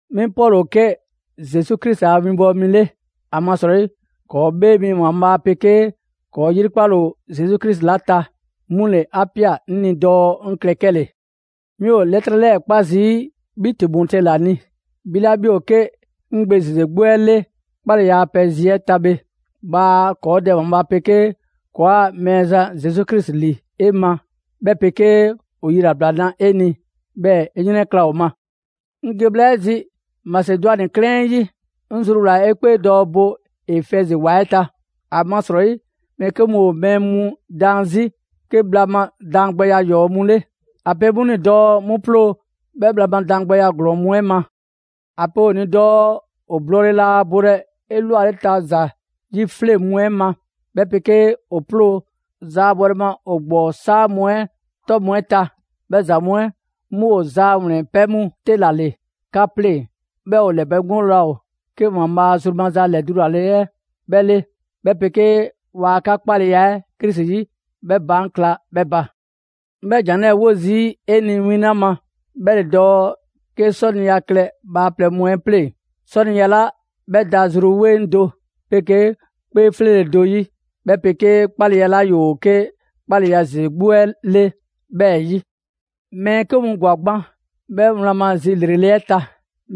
'Mi Pɔlu ‑o 'ke Zesu Krisi a winbɔwo mi 'le, ‑amasrɔyi ‑kɔɔ' 'Bhee Mi ‑Waanbhaa' 'pegee ‑kɔɔ' 'yrikpale ‑o Zesu Krisi 'la ta, 'mu ‑le 'a ꞊pia 'ŋ ni dɔɔ 'ŋ klɛ 'kɛle‑. 'Mi ‑o 'lɛtrɛ 'lɛɛ‑ 'kpa zii' 'bhi Timote ‑la ni, 'bhi 'la 'bhi ‑o 'ke 'ŋ gbe ‑zeze 'gbu 'ɛ 'le 'kpaleya a pɛ zi 'ɛ ta bhe. Bhaa ‑kɔɔ' Dɛ ‑Waanbhaa' 'pegee ‑kɔɔa' Mɛɛzan Zesu Krisi ‑li 'e ma, 'bhɛ 'pegee ‑o yilabla 'na 'e ni, 'bhɛɛ‑ 'e 'yrɛnkla‑ ‑o ma. 'Ŋ ge bhla 'ɛ zi Masedwani 'klɛɛn 'ɛ 'yi, 'ŋ zruwlaa‑ 'e 'kpee dɔɔ 'e bo Efɛzi ‑wa 'ɛ ta. ‑Amasrɔyi mɛɛ 'ke mu ‑o mɛɛ mu daan 'zi 'ke bhla ma daangbɛya 'yɔɔ‑ mu 'le. ‑A pe 'mu ni dɔɔ 'mu 'ploo‑ 'bhɛ bhla ma daangbɛya ‑glɔɔn mu 'ɛ ma. ‑A pe ‑o ni dɔɔ ‑o blɔɔle laa bolɛ 'elwaleta ‑za 'yifleŋ mu 'ɛ ma, 'bhɛ 'pegee ‑o 'ploo‑ ‑zaabɔle ma ‑o ‑gbɔɔ 'saa mu 'ɛ 'tɔ mu 'ɛ ta. 'Bhɛ ‑za mu 'ɛ 'mu ‑o zaa ‑wlɛnpɛ' mu 'te ‑la ‑le 'ka 'pleŋ, 'bhɛɛ‑ ‑o ‑lɛbɛŋgole laa ‑o 'ke ‑Waanbhaa' zru maza ‑lɛdulale 'ɛ 'bhɛ 'le, 'bhɛ 'pegee waa 'ka 'kpaleya 'ɛ Krisi 'yi 'bhɛ baan' kla 'bhɛ ba. 'Ŋ 'bhɛ ‑jan 'lɛɛ‑ 'wo zii' 'e ni win 'la ma, 'bhɛ ‑le dɔɔ 'ke 'sɔniya klɛ bhaaplɛŋ mu 'ɛ pleŋ‑; 'sɔniya 'la 'bhɛ da zru 'weŋ do 'pegee 'kpee 'fleele‑ do 'yi, 'bhɛ 'pegee 'kpaleya 'la ‑yoo 'ke 'kpaleya ‑zeze 'gbu 'ɛ 'le 'bhɛɛ‑ 'yi. Mɛɛ 'ke mu ‑gwa gban 'bhɛ wlan ma zi ‑lrele' 'ɛ ta.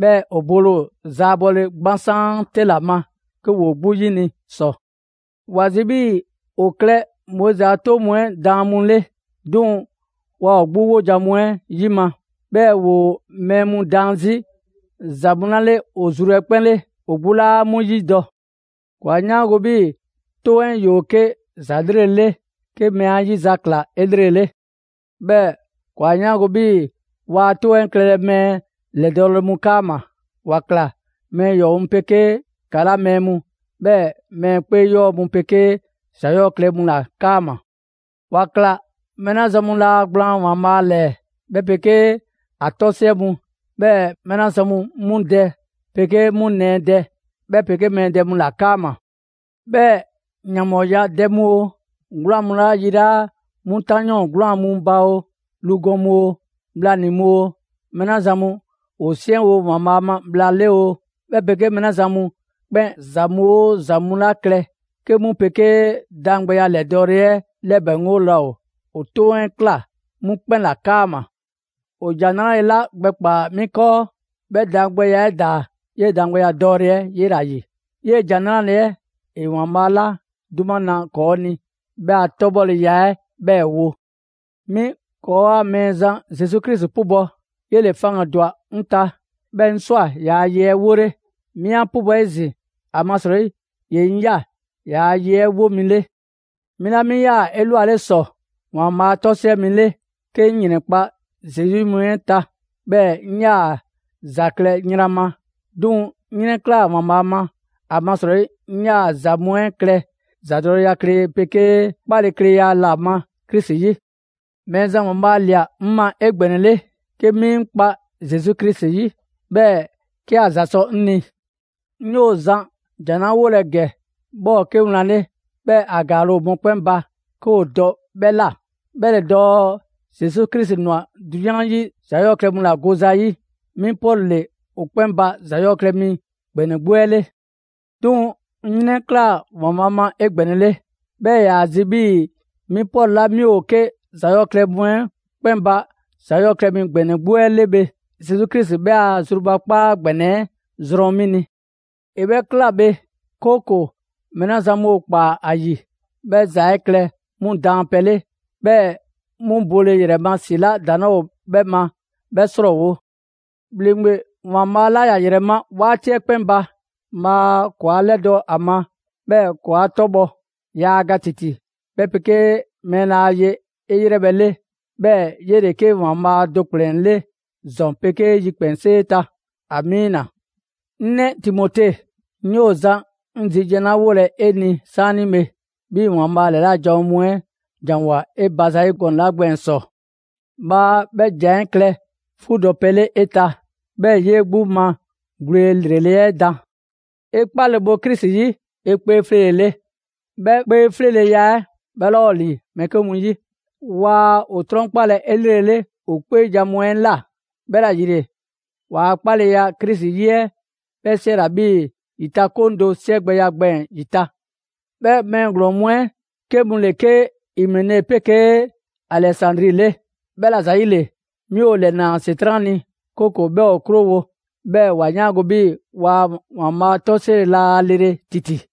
'Bhɛɛ‑ ‑o bole ‑o zaabɔle 'gbansaan 'te ‑la ma 'ke ‑woo 'gbu 'yini‑ ‑sɔ. ‑Wa zi 'bhii‑ ‑o klɛ Moizi a 'toŋ mu 'ɛ daan mu 'le, 'duŋ‑ waa ‑o 'gbu 'wojan‑ mu 'ɛ 'yima‑; 'bhɛɛ‑ ‑woo mɛɛ mu daan 'zi ‑za mu 'la 'le ‑o zru 'ɛ 'kpɛn 'le, ‑o 'gbu 'laa 'mu 'yidɔ‑. ‑Kɔɔ' 'a 'yaango‑ 'bhii‑ 'Toŋ 'ɛ ‑yoo 'ke ‑za 'lrele' 'le 'ke mɛɛ 'a 'yi za ‑kla 'elrele. 'Bhɛɛ‑ ‑kɔɔ' 'a 'yaango‑ 'bhii‑ waa 'Toŋ 'ɛ klɛlɛ mɛɛ ‑lɛdɔɔle mu 'kaama‑. ‑Wa ꞊kla mɛɛ ‑yɔɔ' mu 'pegee ‑kala' mɛɛ mu, 'bhɛɛ‑ mɛɛ 'kpee 'yɔɔ‑ mu 'pegee ‑za 'yɔɔ‑ klɛ mu ‑la 'kaama‑. ‑Wa ‑kla mɛɛ 'la zan mu laa gblaan ‑Waanbhaa' ‑lɛɛ, 'bhɛ 'pegee ‑a 'tɔsiɛ mu, 'bhɛɛ‑ mɛɛ 'la zan mu 'mu dɛ 'pegee 'mu nɛɛ dɛ, 'bhɛ 'pegee mɛɛ dɛ mu ‑la 'kaama‑. 'Bhɛɛ‑ ‑yanbhɔɔya dɛ mu oo, 'gwlaan‑ mu 'la yilaa' 'mu 'tanyɔɔn 'gwlaan‑ mu ba oo; lu gɔn mu oo, bhlanii‑ mu oo, mɛɛ 'la zan mu ‑o 'siɛnwo‑ ‑Waanbhaa' ma bhla 'le oo, 'bhɛ 'pegee mɛɛ 'la zan mu 'kpɛn ‑za mu 'oo ‑za mu 'la klɛ 'ke 'mu 'pegee daangbɛya 'lɛdɔɔle 'ɛ 'lɛbɛŋgole laa ‑o, ‑o 'Toŋ 'ɛ ꞊kla 'mu 'kpɛn ‑la 'kaama‑. ‑O ‑Jan 'Nrale‑ 'la gbɛkpaa‑ 'mi 'kɔɔ, 'bhɛ daangbɛya 'ɛ ‑daa 'yee‑ daangbɛya dɔɔle 'ɛ 'yela‑ ‑yi. 'Yee‑ ‑Jan 'Nrale‑ 'ɛ ‑e ‑Waanbhaa 'la 'duma na ‑kɔɔ' ni 'bhɛ a 'tɔbhɔleya 'ɛ 'bhɛɛ‑ wo. 'Mi ‑kɔɔa' Mɛɛzan Zesu Krisi 'pubɔ, 'yele‑ faŋgandwa 'ŋ ta 'bhɛɛ‑ 'ŋ ꞊swa ‑yaa' ye 'ɛ 'wole. 'Mi 'an 'pubɔ‑ 'ezin‑, ‑amasrɔyi ‑ye 'ŋ ꞊ya ‑yaa' ye 'ɛ 'wo mi 'le. 'Mi 'la 'mi 'yaa‑ 'elwale ‑sɔ ‑Waanbhaa' 'tɔsiɛ mi 'le 'ke 'ŋ ‑yrɛnkpa' Zesu 'yi mu 'ɛ ta, 'bhɛɛ‑ 'ŋ 'yaa‑ ‑za klɛ yran ma. 'Duŋ‑ 'ŋ 'yrɛnklaa‑ ‑Waanbhaa' ma, ‑amasrɔyi 'ŋ 'yaa‑ ‑za mu 'ɛ klɛ ‑zadɔkleya 'pegee 'kpalekleya ‑la ma Krisi 'yi. Mɛɛzan ‑Waanbhaa' ‑lia 'ŋ ma 'egbɛnɛle 'ke 'mi 'ŋ kpa Zesu Krisi 'yi, 'bhɛɛ‑ 'ke ‑a ‑za sɔ 'ŋ ni. 'Ŋ 'yoo‑ zan ‑jan 'la 'wolɛ‑ ‑gɛ 'bhɛ ‑o 'ke wlan 'le, 'bhɛɛ‑ ‑a ‑gaale' ‑o mɔkpɛn' ba 'ke ‑o dɔ 'bhɛ ꞊la; 'bhɛ ‑le dɔɔ: Zesu Krisi ꞊nwa 'drunyan 'yi ‑za 'yɔɔ‑ klɛ mu ‑la gole ‑za 'yi. 'Mi Pɔlu ‑le ‑o 'kpɛn ba ‑za 'yɔɔ‑ klɛ mi ‑gbɛnɛ 'gbu 'ɛ 'le. 'Duŋ‑ 'ŋ 'yrɛnklaa‑ ‑Waanbhaa' ma 'egbɛnɛle. 'Bhɛɛ‑ ‑e ‑yaa zi 'bhii‑ 'mi Pɔlu 'la 'mi ‑o 'ke ‑za 'yɔɔ‑ klɛ mu 'ɛ 'kpɛn ba ‑za 'yɔɔ‑ klɛ mi ‑gbɛnɛ 'gbu 'ɛ 'le bhe, Zesu Krisi 'bhɛ a zrubakpaa ‑gbɛnɛ 'ɛ zrɔn 'mi ni. ‑E 'bhɛ 'kla‑ bhe, 'kooko‑ mɛɛ 'la zan mu ‑o ‑kpaa ‑a ‑yi, 'bhɛ ‑za 'ɛ klɛ 'mu daanpɛ 'le, 'bhɛɛ‑ 'mu bole ‑yrɛ ma ‑si 'la ‑daŋ' 'laa ‑o 'bhɛ ma 'bhɛ 'srɔɔwo‑. ‑Bhleŋgbe ‑Waanbhaa' 'la ‑ya ‑yrɛ ma 'waati 'ɛ 'kpɛn ba, bhaa ‑kɔɔ' 'a 'lɛdɔ‑ ‑a ma, 'bhɛɛ‑ ‑kɔɔ' 'a 'tɔbhɔ. Yaa ga ‑titi, 'bhɛ 'pegee mɛɛ laa ye 'e ‑yrɛ 'le, 'bhɛɛ‑ 'yele‑ 'ke ‑Waanbhaa' do ‑kplɛn 'le ‑zɔn 'pegee ‑yikpɛnsee ta. Amiina! 'Ŋ 'nɛ Timote, 'ŋ 'yoo‑ zan 'ŋ zi jan 'la 'wolɛ‑ 'e ni 'saanibhe, 'bhii‑ ‑Waanbhaa' ‑lɛla' janwo mu 'ɛ ‑janwoa 'e ba zayi' gɔnɛ‑ 'la gbɛɛn‑ ‑sɔ; bhaa 'bhɛ ‑jan 'ɛ klɛ 'fuudɔpɛ 'le 'e ta, 'bhɛɛ‑ 'yee 'gbu ma gwle ‑lrele' 'ɛ dan. 'E 'kpale‑ bo Krisi 'yi, 'e 'kpee 'fleele‑ 'le. 'Bhɛ 'kpee 'fleeleya 'ɛ 'bhɛ 'laa ‑o ‑li mɛɛ 'ke mu 'yi. Waa ‑o 'trɔnkpalɛ 'elrele ‑o 'kpeejan‑ mu 'ɛ ꞊la, 'bhɛla‑ ‑yile ‑waa' 'kpaleya Krisi 'yi 'ɛ 'bhɛ 'siɛla‑ 'bhii‑ ‑yitakoŋ do 'siɛgbɛya gbɛɛn‑ ‑yi ta. 'Bhɛ mɛɛ ‑glɔɔn mu 'ɛ 'ke mu ‑le 'ke Imene 'pegee Alɛzandri 'le. 'Bhɛla‑ ‑zayile, 'mi ‑o ‑lɛnaa ‑Setran' ni, 'kooko‑ 'bhɛ ‑o 'krowo‑, 'bhɛɛ‑ ‑wa 'yaango‑ 'bhii‑ ‑Waanbhaa' 'tɔ 'siɛle‑ laa lele ‑titi.